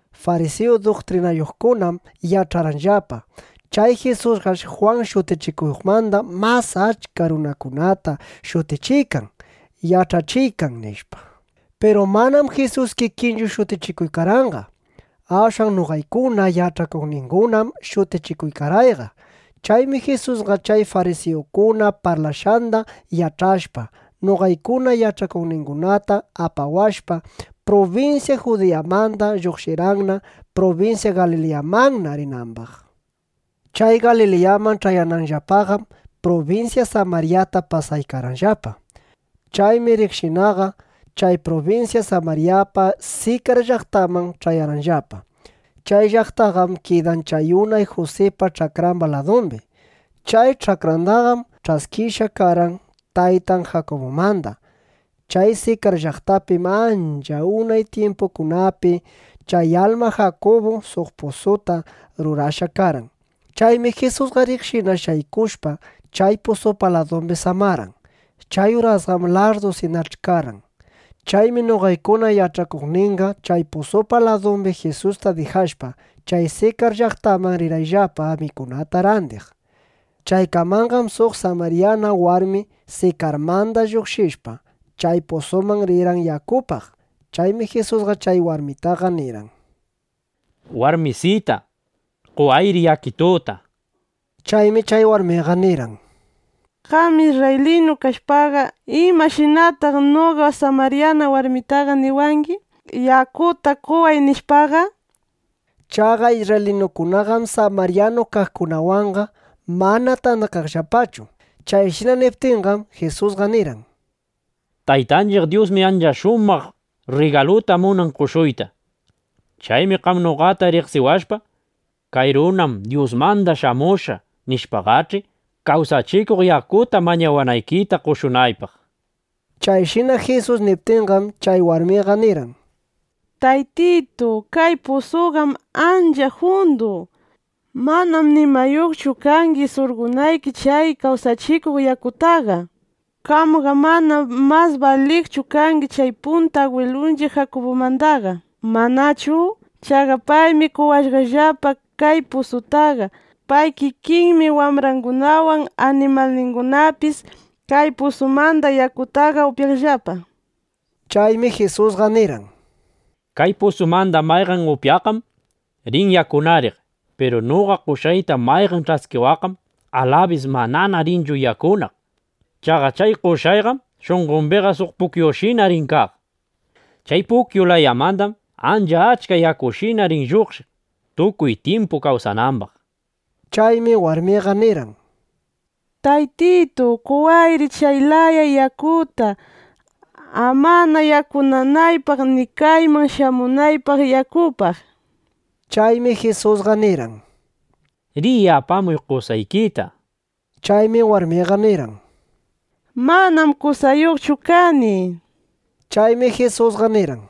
Farisiyu duktrinayuqkunam yach'arqanllapa: Chay Jisusqash Jwan Shutichikuqmanda mas achka runakunata shutichiykan, yach'achiykan, nishpa. Piru manam Jisus kikinchu shutichikurqanqa. Ashwan noqaykuna yach'akuqningunam shutichikurqayqa. Chaymi Jisusqa chay farisiyukuna parlashqanda yach'ashpa, (noqaykuna yach'akuqningunata apawashpa), prubinsya Judiyamanda lluqshirqanna, prubinsya Galiliyamanna rinambaq. Chay Galiliyaman ch'ayanayllapaqam, prubinsya Samaryata pasaykarqayllapa. Chaymi riqshinaqa chay prubinsya Samaryapa Sikar llaqtanman ch'ayarqayllapa. Chay llaqtaqam kidan chay unay Jusipa ch'akramba ladumbi. Chay ch'akrandaqam ch'askishqa karqan taytan Jakubumanda. Chay Sikar llaqtapim ancha unay tyimpukunapi chay alma Jakubu suq pusuta rurashqa karqan. Chaymi Jisusqa riqshina shaykushpa, chay pusupa ladumbi samarqan. Chay urasqam larrdusinach'i karqan. Chaymi noqaykuna yach'akuqninqa chay pusupa ladumbi Jisusta dijashpa, chay Sikar llaqtaman rirqayllapa, mikunata randiq. Chaykamanqam suq samaryana warmi Sikarmanda lluqshishpa, chay pusuman rirqan yakupaq. Chaymi Jisusqa chay warmitaqa nirqan: —Warmisita, qowayri yakituta, nishpa. Chaymi chay warmiqa nirqan: —Qam isrraylinu kashpaqa, ¿imashinataq noqa samaryana warmitaqa niwangi: “Yakuta qoway”, nishpaqa? Chaqa isrraylinukunaqam samaryanu kaqkunawanqa mana tandakaqllapachu. Chayshina niptinqam, Jisusqa nirqan: —Taytanchiq Dyusmi suq ancha shumaq rrigaluta munan qoshuyta. Chaymi qam noqata riqsiwashpa: Kay runam Dyusmanda shamushqa, nishpaqach'i, kawsachikuq yakuta mañawanaykita qoshunaypaq, nishpa. Chayshina Jisus niptinqam, chay warmiqa nirqan: —Taytitu, kay pusuqam ancha jundu. Manam nimayuqchu kangi, surqonayki chay kawsachikuq yakutaqa. Qamqam mana mas baliqchu kangi chay punta agwilunchiq Jakubumandaqa, ¿manachu? Chaqa paymi qowashqallapa kay pusutaqa. Pay kikinmi wambrangunawan, animalningunapis kay pusumanda yakutaqa upyaqllapa, nishpa. Chaymi Jisusqa nirqan: —Kay pusumanda mayqan upyaqqam rin yakunariq. Piru noqa qoshqayta mayqan ch'askiwaqqam, alabis manana rinchu yakunaq. Chaqa chay qoshqayqam shunqombiqa suq pukyushina rin kaq. Chay pukyu layamandam ancha achka yakushina rin lluqshiq, tukuy tyimpu kawsanambaq, nishpa. Chaymi warmiqa nirqan: —Taytitu, qowayri chay laya yakuta, amana yakunanaypaq, ni kayman shamunaypaq yakupaq, nishpa. Chaymi Jisusqa nirqan: —Riy apamuy qosaykita, nishpa. Chaymi warmiqa nirqan: —Manam qosayuqchu kani, nishpa. Chaymi Jisusqa nirqan: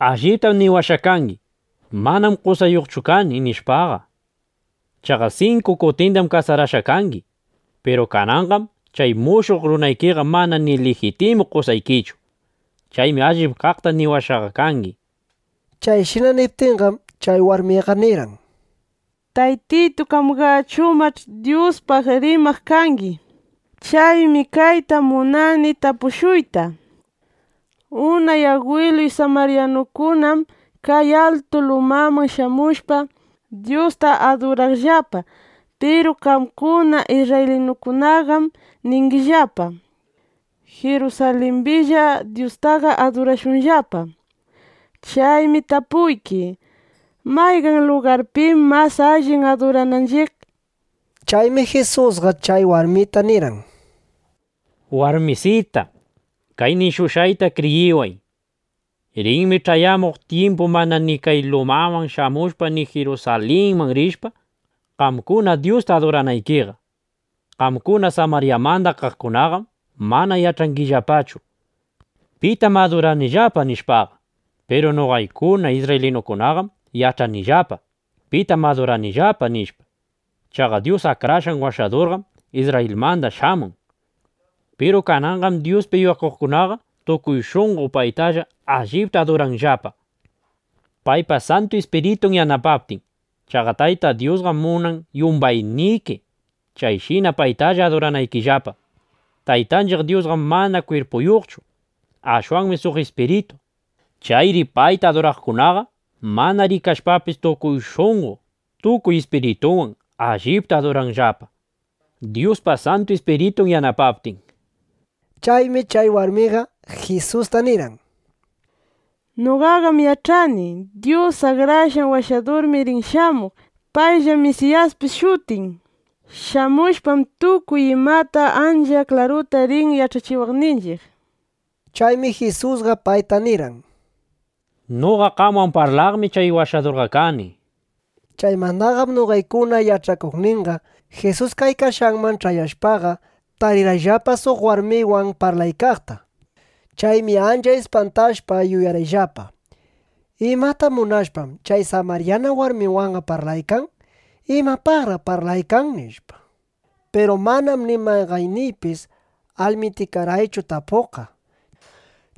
—Alliptam niwashqa kangi: “Manam qosayuqchu kani”, nishpaqa. Chaqa sinku kutindam kasarashqa kangi. Piru kananqam chay mushuq runaykiqa mana ni lijitimu qosaykichu. Chaymi allip kaqta niwashqaqa kangi, nishpa. Chayshina niptinqam, chay warmiqa nirqan: —Taytitu, qamqachumash' Dyuspaq rimaq kangi. Chaymi kayta munani tapushuyta: Unay agwiluy samaryanukunam kay altu lumaman shamushpa, Dyusta aduraqllapa. Piru qamkuna isrraylinukunaqam ningillapa: “Jirusalimbilla Dyustaqa adurashunllapa”, nishpa. (Chaymi tapuyki: ¿Mayqan lugarpim mas allin adurananchiq? nishpa.) Chaymi Jisusqa chay warmita nirqan: —Warmisita, kay nishushqayta kriyiway; Rinmi ch'ayamuq tyimpu, mana ni kay lumaman shamushpa, ni Jirusalinman rishpa, qamkuna Dyusta aduranaykiqa. Qamkuna Samaryamanda kaqkunaqam mana yach'angillapachu: Pitam aduranillapa, nishpaqa. Piru noqaykuna isrraylinukunaqam yach'anillapa: Pitam aduranillapa, nishpa. Chaqa Dyus Akrashqan Washadurqam Isrrayilmanda shamun. Piru kananqam Dyuspi yuyakuqkunaqa tukuy shunqo payta allipta aduranqallapa, paypa Santu Ispiritun yanapaptin. Chaqa Tayta Dyusqam munan, yumbayniki chayshina paytalla aduranaykillapa. Taytanchiq Dyusqam mana kwirpuyuqchu. Ashwanmi suq ispiritu. Chayri payta aduraqkunaqa mana rikashpapis, tukuy shunqo, tukuy ispiritunwan allipta aduranqallapa, Dyuspa Santu Ispiritun yanapaptin. Chaymi chay warmiqa Jisusta nirqan: —Noqaqam yach'ani: Dyus Akrashqan Washadurmi rin shamuq. Payllam Misiyaspis shutin. Shamushpam, tukuy imata ancha klaruta rin yach'achiwaqninchiq, nishpa. Chaymi Jisusqa payta nirqan: —Noqa qamwan parlaqmi chay Washadurqa kani, nishpa. Chaymandaqam noqaykuna yach'akuqninqa Jisus kaykashqanman ch'ayashpaqa, tarirqayllapa suq warmiwan parlaykaqta. Chaymi ancha ispantashpa yuyarqayllapa: ¿Imata munashpam, chay samaryana warmiwanqa parlaykan? ¿Imapaqraq parlaykan? nishpa. Piru manam ni mayqanniypis almitikarqaychu tapuqqa.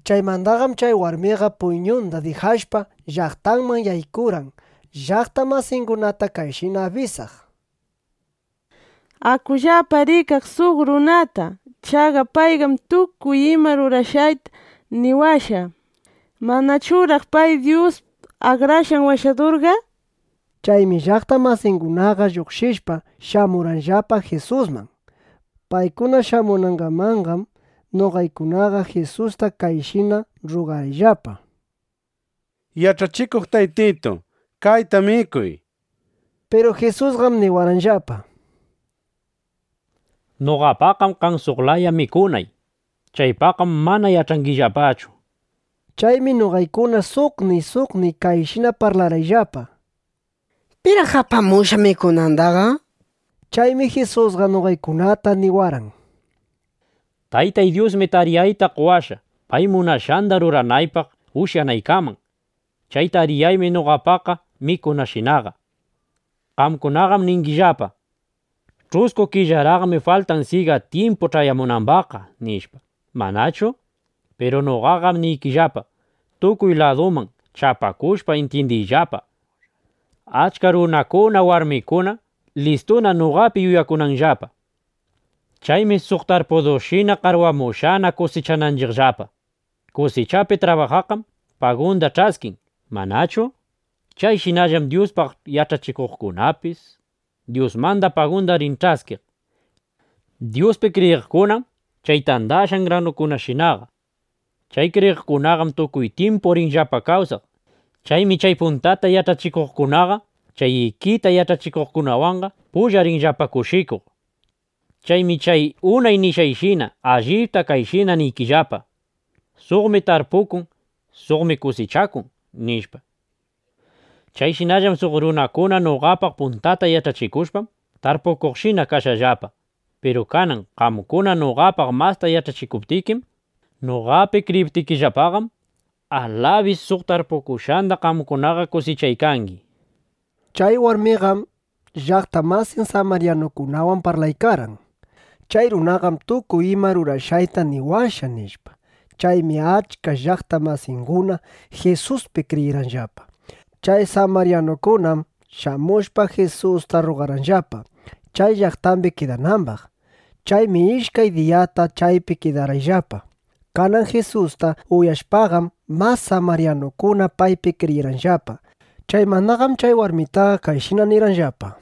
Chaymandaqam chay warmiqa puyñunda dijashpa, llaqtanman yaykurqan, llaqta masingunata kayshina abisaq: —Akullapa rikaq suq runata. Chaqa payqam tukuy ima rurashqayta niwashqa. ¿Manachuraq pay Dyus Akrashqan Washadurqa? nishpa. Chaymi llaqta masingunaqa lluqshishpa, shamurqanllapa Jisusman. Paykuna shamunangamanqam, noqaykunaqa Jisusta kayshina rrugarqayllapa: —Yach'achikuq Taytitu, kayta mikuy, nishpa. Piru Jisusqam niwarqanllapa: —Noqapaqam kan suq laya mikunay. Chaypaqqam mana yach'angillapachu, nishpa. Chaymi noqaykuna suqniy suqniy kayshina parlarqayllapa: —¿Piraq apamushqa mikunandaqa? nishpa. Chaymi Jisusqa noqaykunata niwarqan: —Taytay Dyusmi tariyayta qowashqa, pay munashqanda ruranaypaq ushyanaykaman. Chay tariyaymi noqapa mikunayshinaqa. Qamkunaqam ningillapa: “Ch'usku killaraqmi faltan, syiga tyimpu ch'ayamunambaqqa”, nishpa, ¿manachu? Piru noqaqam niykillapa, tukuy laduman chapakushpa, intyindiyllapa: Achka runakuna, warmikunam listuna, noqapi yuyakunanllapa. Chaymi suq tarpudushina qarwamushqana kusichananchiqllapa. Kusichapi trabajaqqam pagunda ch'askin, ¿manachu? Chayshinallam Dyuspaq yach'achikuqkunapis Dyusmanda pagunda rin ch'askiq. Dyuspi kriyiqkunam chay tandashqan granukunashinaqa. Chay kriyiqkunaqam tukuy tyimpu rinllapa kawsaq. Chaymi chay puntata yach'achiqkunaqa, chay ikita yach'achiqkunawan pulla rinllapa kushikuq. Chaymi chay unay nishqanshina allipta kayshina niykillapa: “Suqmi tarpukun, suqmi kusichakun”, nishpa. Chayshinallam suq runakuna noqapaq puntata yach'achikushpam, tarpukuqshina kashqallapa. Piru kanan qamkuna noqapaq masta yach'achikuptikim, noqapi kriyiptinllapaqam, alabis suq tarpukushqanda qamkunaqa kusichaykangi, nishpa. Chay warmiqam llaqta masin samaryanukunawan parlaykarqan, “Chay runaqam tukuy ima rurashqayta niwashqa”, nishpa. Chaymi achka llaqta masinguna Jisuspi kriyirqanllapa. Chay samaryanukunam shamushpa, Jisusta rrugarqanllapa, chay llaqtambi kidanambaq. Chaymi ishkay diyata chaypi kidarqayllapa. Kanan Jisusta uyashpaqam, mas samaryanukuna paypi kriyirqanllapa. Chaymandaqam chay warmitaqa kayshina nirqanllapa: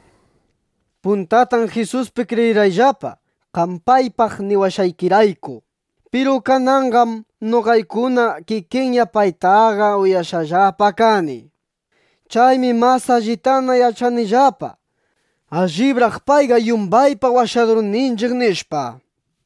—Puntatam Jisuspi kriyirqayllapa, qam paypaq niwashqaykirayku. Piru kananqam noqaykuna kikiyna paytaqa uyashqallapa kani. Chaymi mas allitana yach'anillapa: Allibraq payqa yumbaypa Washadurninchiq, nishpa.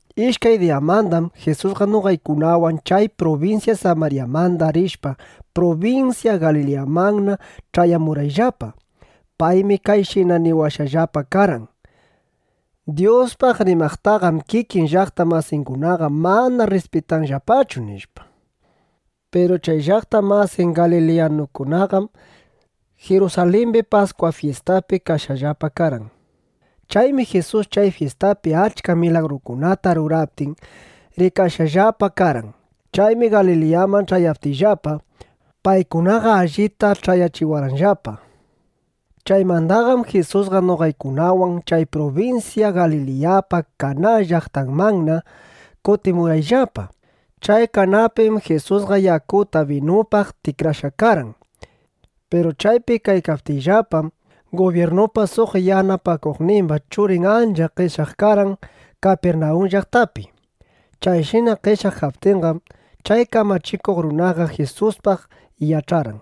Ishkay diyamandam Jisusqa noqaykunawan chay prubinsya Samaryamanda rishpa, prubinsya Galiliyamanna ch'ayamurqayllapa. Paymi kayshina niwashqallapa karqan: “Dyuspaq rimaqtaqam kikin llaqta masingunaqa mana rrispitanllapachu”, nishpa. Piru chay llaqta masin galiliyanukunaqam Jirusalimbi Paskwa fyistapi kashqallapa karqan. Chaymi Jisus chay fyistapi achka milagrukunata ruraptin, rikashqallapa karqan. Chaymi Galiliyaman ch'ayaptiyllapa, paykunaqa allita ch'ayachiwarqanllapa. Chaymandaqam Jisusqa noqaykunawan chay prubinsya Galiliyapa Kaná llaqtanmanna kutimurqayllapa. Chay Kanapim Jisusqa yakuta binupaq tikrashqa karqan. Piru chaypi kaykaptiyllapam, gubyirnupa suq yanapakuqnimba churin ancha qeshyaq karqan Kapirnawun llaqtapi. Chayshina qeshyaq kaptinqam, chay kamachikuq runaqa Jisuspaq yach'arqan: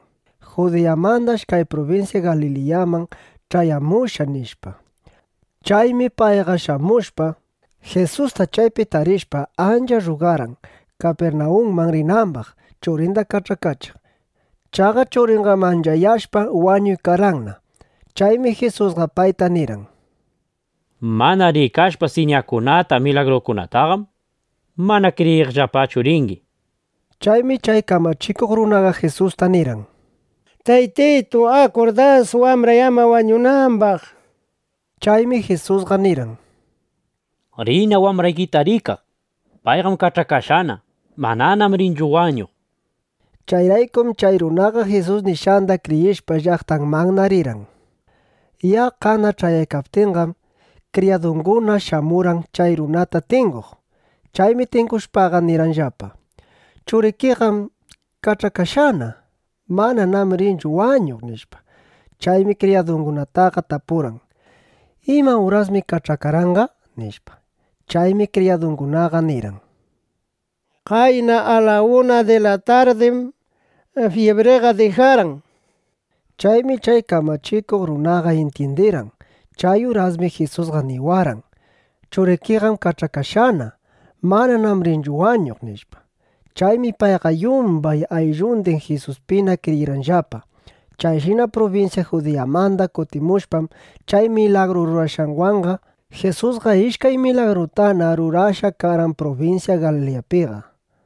Judiyamandash kay prubinsya Galiliyaman ch'ayamushqa, nishpa. Chaymi payqa shamushpa, Jisusta chaypi tarishpa, ancha rrugarqan, Kapirnawunman rinambaq, churinda kach'akachiq. Chaqa churinqam anchayashpa, wañuykarqanna. Chaymi Jisusqa payta nirqan: —Mana rikashpa siñakunata, milagrukunataqam, mana kriyiqllapachu ringi, nishpa. Chaymi chay kamachikuq runaqa Jisusta nirqan: —Taytitu, akur das, wambray ama wañunambaq, nishpa. Chaymi Jisusqa nirqan: —Riyna wambraykita rikaq. Payqam kach'akashqana. Mananám rinchu wañuq, nishpa. Chayraykum chay runaqa Jisus nishqanda kriyishpa, llaqtanmanna rirqan. Yaqqana ch'ayaykaptinqam, kriyadunguna shamurqan chay runata tinguq. Chaymi tingushpaqa, nirqanllapa: —Churikiqam kach'akashqana. Mananám rinchu wañuq, nishpa. Chaymi kriyadungunataqa tapurqan: —¿Ima urasmi kach'akarqanqa? nishpa. Chaymi kriyadungunaqa nirqan: —Qayna a la una di la tardim jibriqa dijarqan, nishpa. Chaymi chay kamachikuq runaqa intyindirqan: Chay urasmi Jisusqa niwarqan: “Churikiqam kach'akashqana. Mananám rinchu wañuq”, nishpa. Chaymi payqa yumbay ayllundin Jisuspina kriyirqanllapa. Chayshina prubinsya Judiyamanda kutimushpam, chay milagru rurashqanwanqa, Jisusqa ishkay milagrutana rurashqa karqan prubinsya Galiliyapiqa.